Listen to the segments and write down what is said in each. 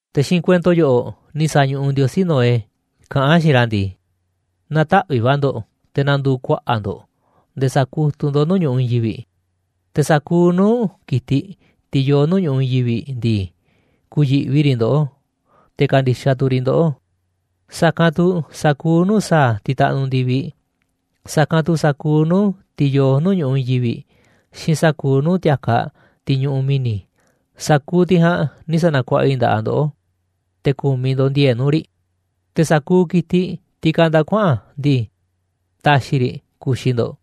Te̱ xiinꞌ kuento yoꞌoꞌ ni̱ sa̱ñuꞌuꞌ Ndiosí Noé kaꞌán a̱ xiinꞌ ra̱ ndii: ―Na̱taꞌvi̱ꞌ va̱ ndo̱ꞌ, te̱ na̱ndu̱u̱ kuaꞌa̱ꞌ ndo̱ꞌ nde̱e̱ sa̱kutuꞌ ndo̱ꞌ nuu̱ꞌ ñu̱ꞌuꞌ i̱i̱n yivi̱ꞌ. Te̱ sa̱kuuꞌ nuu̱ꞌ ki̱tiꞌ, tiꞌ yoo nuu̱ꞌ ñu̱ꞌuꞌ i̱i̱n yivi̱ꞌ ndii, ku̱yi̱ꞌvi riꞌ ndoꞌó, te̱ ka̱ndi̱xaꞌ tu̱ riꞌ ndoꞌó, sa̱kanꞌ tu̱ sa̱kuuꞌ nuu̱ꞌ sa̱a̱ tiꞌ taꞌnuꞌ ndi̱viꞌ, sa̱kanꞌ tu̱ sa̱kuuꞌ nuu̱ꞌ tiꞌ yoo nuu̱ꞌ ñu̱ꞌuꞌ i̱i̱n yivi̱ꞌ, xiinꞌ sa̱kuuꞌ nuu̱ꞌ ti̱a̱kaꞌ tiꞌ ñuꞌuꞌ mi̱ni̱. Sa̱kuuꞌ tiꞌ ja̱a̱nꞌ ni̱ sa̱na̱kuaꞌa i̱ nda̱ꞌaꞌ ndoꞌó, te̱ ku̱miꞌ ndo̱ꞌ ndi̱e̱e̱ꞌ nuu̱ꞌ riꞌ. Te̱ sa̱kuuꞌ ki̱tiꞌ tiꞌ kanda kuaꞌa̱n ndii, taxiꞌ i̱ riꞌ ku̱xi̱ ndo̱ꞌ,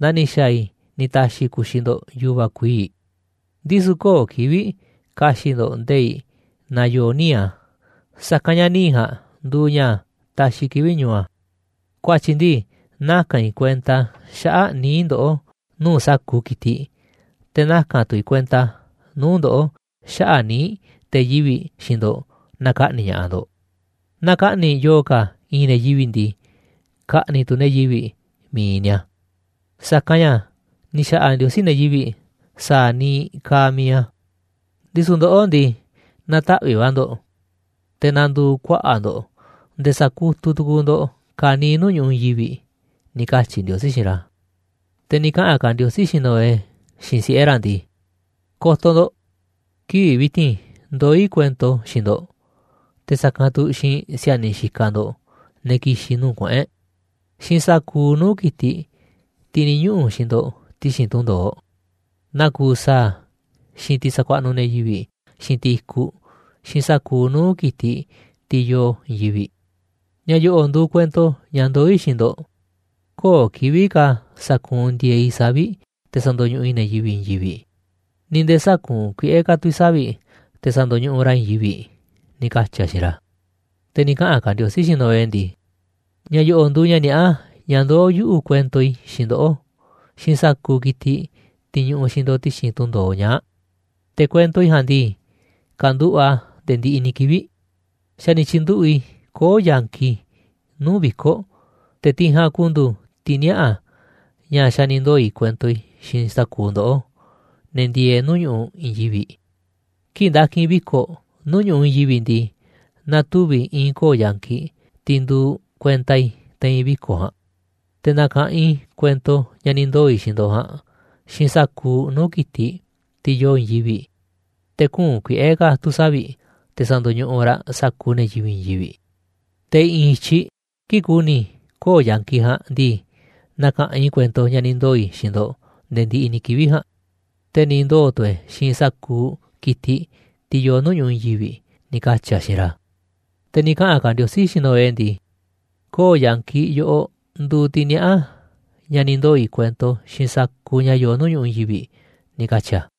naa ni̱ xa̱a̱ i̱ ni̱ ta̱xi̱ i̱ ku̱xi̱ ndo̱ꞌ yu̱va̱ kuii̱ꞌ. Ndisu̱ köo̱ꞌ kivi̱ꞌ ka̱xi̱ꞌ ndo̱ꞌ nde̱i̱ꞌ naaꞌ yoo níiꞌ a̱, sa̱kanꞌ ña̱ níiꞌ ja̱a̱nꞌ nduuꞌ ña̱ taxiꞌ kivi̱ꞌ ñu̱u a̱. Ku̱a̱tyi̱ ndii, naka̱n i̱ kuenta xaꞌa̱ꞌ níiꞌ ndoꞌó nuu̱ꞌ sa̱kuuꞌ ki̱tiꞌ, te̱ naka̱n tu̱ i̱ kuenta nuu̱ꞌ ndoꞌó xaꞌa̱ꞌ níiꞌ te̱ yivi̱ꞌ xiinꞌ ndo̱ꞌ naaꞌ ka̱ꞌni̱ꞌ ña̱ꞌaꞌ ndo̱ꞌ. Naaꞌ ka̱ꞌni̱ꞌ yo̱o̱ ka̱ i̱i̱n ne̱ yivi̱ꞌ ndii, ka̱ꞌni̱ꞌ tu̱ ne̱ yivi̱ꞌ mi̱iꞌ ni̱a̱, sa̱kanꞌ ña̱ ni̱ xa̱ꞌa̱ Ndiosí ne̱ yivi̱ꞌ sa̱a̱ niiꞌ kaaꞌ mi̱iꞌ a̱. Ndisu̱ ndoꞌó ndii, na̱taꞌvi̱ꞌ va̱ ndo̱ꞌ te̱ na̱ndu̱u̱ kuaꞌa̱ꞌ ndo̱ꞌ nde̱e̱ sa̱kutuꞌ tu̱ku̱u̱ ndo̱ꞌ ka̱niiꞌ nuu̱ꞌ ñu̱ꞌuꞌ i̱i̱n yivi̱ꞌ ―ni̱ katyi̱ Ndiosí xiinꞌ ra̱. Te̱ ni̱ kaꞌa̱n ka̱ Ndiosí xiinꞌ Noé, xiinꞌ siꞌe̱ ra̱ ndii: ―Ko̱to̱ ndo̱ꞌ, kivi̱ꞌ vi̱ti̱n ndoó i̱ kuento xiinꞌ ndo̱ꞌ, te̱ sa̱kanꞌ tu̱ xiinꞌ si̱a̱niꞌ xikaꞌ ndo̱ꞌ, ne̱ ki̱xi̱n nuu̱ꞌ kuꞌu̱n e̱ꞌ, xiinꞌ sa̱kuuꞌ nuu̱ꞌ ki̱tiꞌ, tiꞌ ni̱ ñuꞌu̱ xiinꞌ ndo̱ꞌ ti̱xi̱n tunꞌ ndo̱oꞌ: Naa kuuꞌ sa̱a̱, xiinꞌ tiꞌ sakuaꞌnuꞌ ne̱ yivi̱ꞌ xiinꞌ tiꞌ i̱kuꞌ, xiinꞌ sa̱kuuꞌ nuu̱ꞌ ki̱tiꞌ, tiꞌ yoo i̱i̱n yivi̱ꞌ. Ña̱ yo̱ꞌo̱ nduuꞌ kuento ña̱ ndoó i̱ xiinꞌ ndo̱ꞌ: Köo̱ꞌ kivi̱ꞌ ka̱ sa̱kuunꞌ ndi̱e̱eꞌ i̱ savi̱ꞌ te̱ sa̱ndo̱ñuꞌuꞌ i̱ ne̱ yivi̱ꞌ i̱i̱n yivi̱ꞌ, ni̱ nde̱e̱ sä̱kuunꞌ kuiꞌe̱ ka̱ tu̱ i̱ savi̱ꞌ te̱ sa̱ndo̱ñuꞌuꞌ raꞌ i̱i̱n yivi̱ꞌ ―ni̱ katyi̱ a̱ xiinꞌ ra̱. Te̱ ni̱ kaꞌa̱n ka̱ Ndiosí xiinꞌ Noé ndii: ―Ña̱ yo̱ꞌo̱ nduuꞌ ña̱ niaꞌá ña̱ ndoó yuꞌu̱ kuento i̱ xiinꞌ ndoꞌó, xiinꞌ sa̱kuuꞌ ki̱tiꞌ, tiꞌ ñuꞌuꞌ xiinꞌ ndo̱ꞌ ti̱xi̱n tunꞌ ndo̱oꞌ ñaa̱ꞌ, te̱ kuento i̱ ja̱a̱nꞌ ndii, ka̱nduꞌu̱ꞌ a̱ nde̱e̱ ndiꞌiꞌ ni̱ kivi̱ꞌ. Xa̱ ni̱ tyi̱nduꞌu̱ꞌ i̱ koo̱ꞌ yankiꞌ i̱ nuu̱ꞌ viko̱ꞌ, te̱ tiꞌ ja̱a̱nꞌ ku̱ndu̱u̱ tiꞌ niaꞌa̱ ña̱ xa̱ ni̱ ndoo̱ i̱ kuento i̱ xiinꞌ sa̱kuuꞌ ndoꞌó, ne̱ ndieeꞌ nuu̱ꞌ ñu̱ꞌuꞌ i̱i̱n yivi̱ꞌ. Kii̱ꞌ nda̱ki̱n i̱ viko̱ꞌ nuu̱ꞌ ñu̱ꞌuꞌ i̱i̱n yivi̱ꞌ ndii, na̱tuvi̱ i̱i̱n koo̱ꞌ yankiꞌ tiꞌ nduuꞌ kuenta i̱ te̱i̱n viko̱ꞌ ja̱a̱nꞌ. Te̱ na̱ka̱ꞌanꞌ i̱ kuento ña̱ ni̱ ndoo̱ i̱ xiinꞌ ndo̱ꞌ ja̱a̱nꞌ, xiinꞌ sa̱kuuꞌ nuu̱ꞌ ki̱tiꞌ, tiꞌ yoo i̱i̱n yivi̱ꞌ, te̱ kü̱u̱n kuiꞌe̱ ka̱ tu̱ savi̱ꞌ, te̱ sa̱ndo̱ñuꞌuꞌ raꞌ sa̱kuuꞌ ne̱ yivi̱ꞌ i̱i̱n yivi̱ꞌ. Te̱ i̱ꞌi̱n i̱tyiꞌ kii̱ꞌ ku̱ni̱ i̱ koo̱ꞌ yankiꞌ ja̱a̱nꞌ ndii, na̱ka̱ꞌanꞌ i̱ kuento ña̱ ni̱ ndoo̱ i̱ xiinꞌ ndo̱ꞌ nde̱e̱ ndiꞌiꞌ ni̱ kivi̱ꞌ ja̱a̱nꞌ, te̱ ni̱ ndoo̱ tu̱ e̱ xiinꞌ sa̱kuuꞌ ki̱tiꞌ, tiꞌ yoo nuu̱ꞌ ñu̱ꞌuꞌ i̱i̱n yivi̱ꞌ ―ni̱ katyi̱ a̱ xiinꞌ ra̱. Te̱ ni̱ kaꞌa̱n ka̱ Ndiosí xiinꞌ Noé ndii: ―Koo̱ꞌ yankiꞌ yoꞌoꞌ nduuꞌ tiꞌ niaꞌá ña̱ ni̱ ndoo̱ i̱ kuento xiinꞌ sa̱kuuꞌ ña̱ yoo nuu̱ꞌ ñu̱ꞌuꞌ i̱i̱n yivi̱ꞌ ―ni̱ katyi̱ a̱.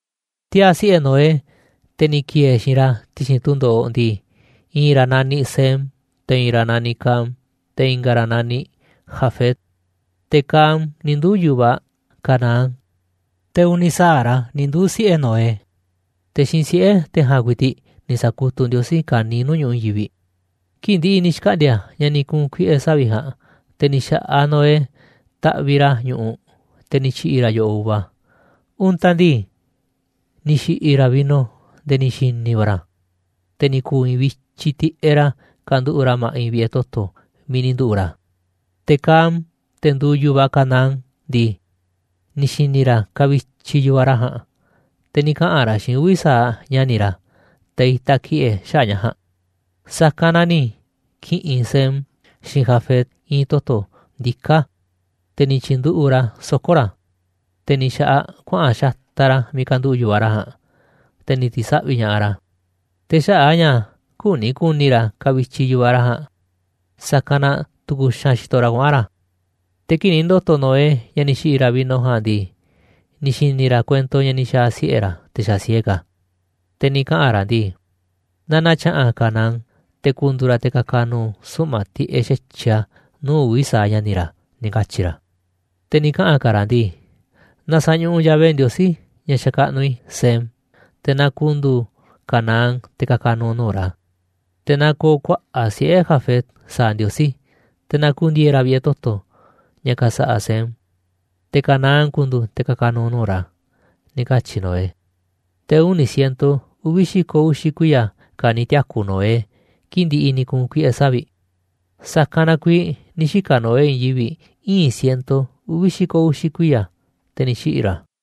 Tiaa̱ siꞌe̱ Noé, te̱ ni̱ ki̱e̱e̱ xiinꞌ ra̱ ti̱xi̱n tunꞌ ndo̱oꞌ ndii, i̱i̱n ra̱ naniꞌ Sem, te̱ i̱i̱n ra̱ naniꞌ Cam, te̱ i̱nga̱ ra̱ naniꞌ Jafet, te̱ Cam ni̱ nduu̱ yu̱vaꞌ Canaán. Te̱ uni̱ sa̱aꞌ ra̱ ni̱ nduu̱ꞌ siꞌe̱ Noé, te̱ xiinꞌ siꞌe̱ te̱ ja̱a̱nꞌ ku̱i̱ti̱ꞌ ni̱ sa̱kutuꞌ Ndiosí ka̱niiꞌ nuu̱ꞌ ñu̱ꞌuꞌ i̱i̱n yivi̱ꞌ. Kii̱ꞌ ndi̱ꞌi̱ ni̱ xkaꞌndi̱a̱ ña̱ ni̱ ku̱u̱n kuiꞌe̱ savi̱ꞌ ja̱a̱nꞌ, te̱ ni̱ xa̱ꞌaꞌ Noé taꞌviꞌ ra̱ ñu̱ꞌuꞌ, te̱ ni̱ tyi̱ꞌi̱ ra̱ yo̱ꞌoꞌ uva. Untaꞌ ndii, ni̱ xi̱ꞌi̱ ra̱ vino nde̱e̱ ni̱ xi̱ni̱ va̱ ra̱, te̱ ni̱ ku̱u̱ i̱i̱nꞌ vityiꞌ tiꞌeꞌ ra̱ kanduꞌu̱ꞌ ra̱ ma̱ꞌiꞌ vi̱ꞌe̱ toto̱ miiꞌ ni̱ nduꞌu̱ꞌ ra̱. Te̱ Cam, te̱ nduuꞌ yu̱vaꞌ Canaán ndii, ni̱ xi̱ni̱ ra̱ kavityiꞌ yu̱vaꞌ ra̱ ja̱a̱nꞌ, te̱ ni̱ kaꞌa̱n ra̱ xiinꞌ uvi̱ sa̱aꞌ ña̱ni̱ ra̱, te̱ itaꞌ ki̱ꞌe̱ xaꞌa̱ꞌ ña̱ ja̱a̱nꞌ. Sa̱kanꞌ na ni̱ ki̱ꞌi̱n Sem, xiinꞌ Jafet i̱i̱n toto̱ ndiká, te̱ ni̱ tyi̱nduꞌu̱ꞌ ra̱ a̱ soko̱ ra̱, te̱ ni̱ xa̱ꞌaꞌ kuaꞌa̱n xataꞌ ra̱ miiꞌ kanduꞌu̱ꞌ yu̱vaꞌ ra̱ ja̱a̱nꞌ, te̱ ni̱ ti̱saꞌvi̱ ña̱ꞌaꞌ ra̱. Te̱ xaꞌa̱ꞌ a̱ ña̱ küni ku̱ni̱ ra̱ kavityiꞌ yu̱vaꞌ ra̱ ja̱a̱nꞌ, sa̱kanꞌ na tu̱ku̱ xaanꞌ xitoꞌ ra̱ kuaꞌa̱n ra̱. Te̱ kii̱ꞌ ni̱ ndo̱to̱ Noé ña̱ ni̱ xi̱ꞌi̱ ra̱ vino ja̱a̱nꞌ ndii, ni̱ xi̱ni̱ ra̱ kuento ña̱ ni̱ xa̱a̱ siꞌe̱ ra̱, te̱ xa̱ siee ka̱, te̱ ni̱ kaꞌa̱n ra̱ ndii: ―Na na̱tya̱ꞌa̱n Canaán, te̱ ku̱ndu̱u̱ ra̱ te̱ ka̱ka̱ nu̱u̱ suꞌma̱ꞌ tiꞌeꞌ xa̱tyiꞌ a̱ nuu̱ꞌ uvi̱ sa̱aꞌ ña̱ni̱ ra̱ ―ni̱ katyi̱ ra̱. Te̱ ni̱ kaꞌa̱n ka̱ ra̱ ndii: ―Na sa̱ñuꞌuꞌ Yahvé Ndiosí ña̱ xakaꞌnuꞌ i̱ Sem, te̱ na ku̱ndu̱u̱ Canaán te̱ ka̱ka̱ nu̱u̱ nuu̱ꞌ ra̱. Te̱ na ko̱o̱ kuaꞌa̱ꞌ siꞌe̱ Jafet sa̱a̱ Ndiosí, te̱ na ku̱ndi̱e̱e̱ ra̱ vi̱ꞌe̱ toto̱, ña̱ ka̱sa̱ꞌa̱ Sem, te̱ Canaán ku̱ndu̱u̱ te̱ ka̱ka̱ nu̱u̱ nuu̱ꞌ ra̱ ―ni̱ katyi̱ Noé. Te̱ uni̱ ciento uvi̱ xi̱ko̱ uxi̱ kuiya̱ ka̱ ni̱ tiaku̱ Noé kii̱ꞌ ndi̱ꞌi̱ ni̱ ku̱u̱n kuiꞌe̱ savi̱ꞌ. Sa̱kanꞌ na kuiiꞌ ni̱ xika̱ Noé i̱i̱n yivi̱ꞌ ii̱n ciento uvi̱ xi̱ko̱ uxi̱ kuiya̱, te̱ ni̱ xiꞌi̱ ra̱.